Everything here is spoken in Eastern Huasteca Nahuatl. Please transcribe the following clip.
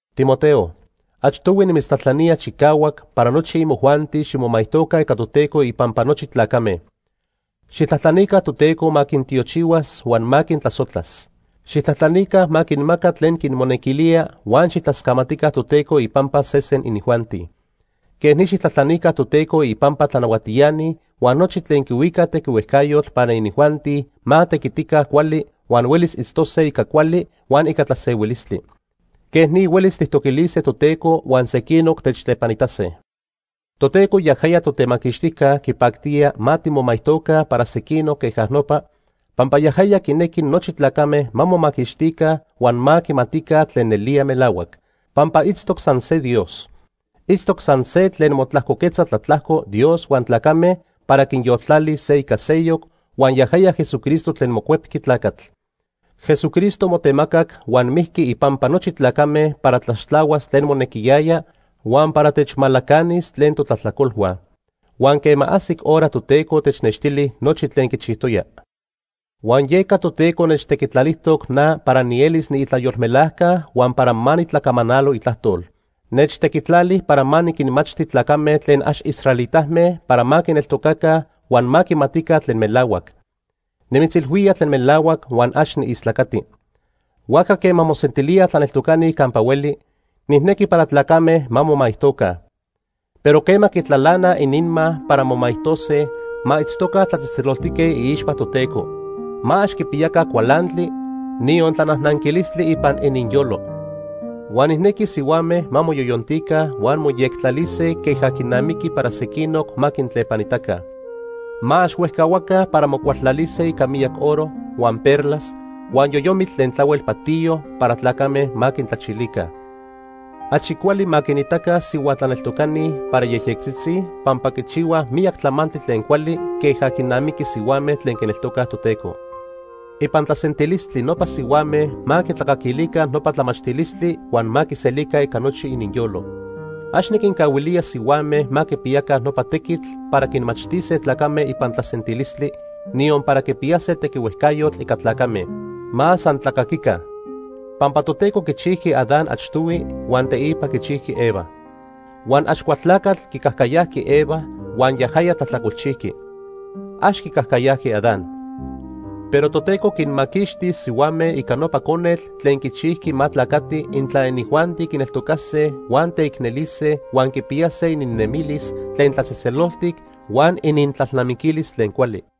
Timoteo, achtohui nimitztlajtlanía chicahuac para nochi imojuanti ximomaijtoca ica Toteco ipampa nochi tlacame. Xijtlajtlanica Toteco ma quintiochihuas huan ma quintlasojtlas. Xijtlajtlanica ma quinmaca tlen quimonequilía huan xijtlascamatica Toteco ipampa sesen inijuanti. Quej ni xijtlajtlanica Toteco ipampa tlanahuatiani huan nochi tlen quihuicaj tequihuejcayotl para inijuanti ma tequitica cuali huan huelis tiitztose ica cuali huan ica tlasehuilistli. Quej ni huelis tijtoquilise Toteco huan sequinoc techtlepanitase. Toteco yajaya Totemaquixtijca quipactía ma timomaijtoca para sequinoc queja nopa, pampa yajaya quinequi nochi tlacame ma momaquixtica huan ma quimatica tlen nelía melahuac. Pampa itztoc san se Dios. Itztoc san se tlen motlajcoquetza tlatlajco Dios huan tlacame para quinyoltlalis se ica seyoc, huan yajaya Jesucristo tlen mocuepqui tlacatl. Jesucristo motemacac huan mijqui ipampa nochi tlacame para tlaxtlahuas tlen monequiyaya huan para techmalacanis tlen totlajtlacolhua. Huan quema ajsic hora Toteco technextili nochi tlen quichijtoya. Huan yeca Toteco nechtequitlalijtoc na para nielis niitlayolmelajca huan para ma nitlacamanalo itlajtol. Nechtequitlali para ma niquinmachti tlacame tlen ax israelitame para ma quineltocaca huan ma quimatica tlen melahuac. Nimitzilhuía tlen melahuac huan ax niistlacati. Huajca quema mosentilíaj tlaneltocani campa hueli, nijnequi para tlacame ma momaijtoca. Pero quema quitlalanaj ininma para momaijtose ma itztoca tlatzejtzeloltique iixpa Toteco. Ma ax quipiyaca cualantli niyon tlanajnanquilistli ipan ininyolo. Huan nijnequi sihuame ma moyoyontica huan moyectlalise queja quinamiqui para sequinoc ma quintlepanitaca. Ma ax huejcahuaca para mocualtlalise ica miyac oro, huan perlas, huan yoyomitl tlen tlahuel patiyo para tlacame ma quintlachilica. Achi cuali ma quinitaca sihua tlaneltocani para yejyectzitzi pampa quichihuaj miyac tlamantli tlen cuali queja quinamiqui sihuame tlen quineltocaj Toteco. Ipan tlasentilistli nopa sihuame ma quitlacaquilica nopa tlamachtilistli huan ma quiselica ica nochi ininyolo. Ax niquincahuilía sihuame ma quipiyaca nopa tequitl para quinmachtise tlacame ipan tlasentilistli, niyon para quipiyase tequihuejcayotl ica tlacame. Ma san tlacaquica. Pampa Toteco quichijqui Adán achtohui huan teipa quichijqui Eva. Huan Axcualtlacatl quicajcayajqui Eva huan yajaya tlajtlacolchijqui. Ax quicajcayajqui Adán. Pero Toteco quinmaquixtis sihuame ica nopa conetl tlen quichijqui ma tlacati intla inijuanti quineltocase huan teicnelise huan quipiyase ininnemilis tlen tlatzejtzeloltic huan inintlalnamiquilis tlen cuali.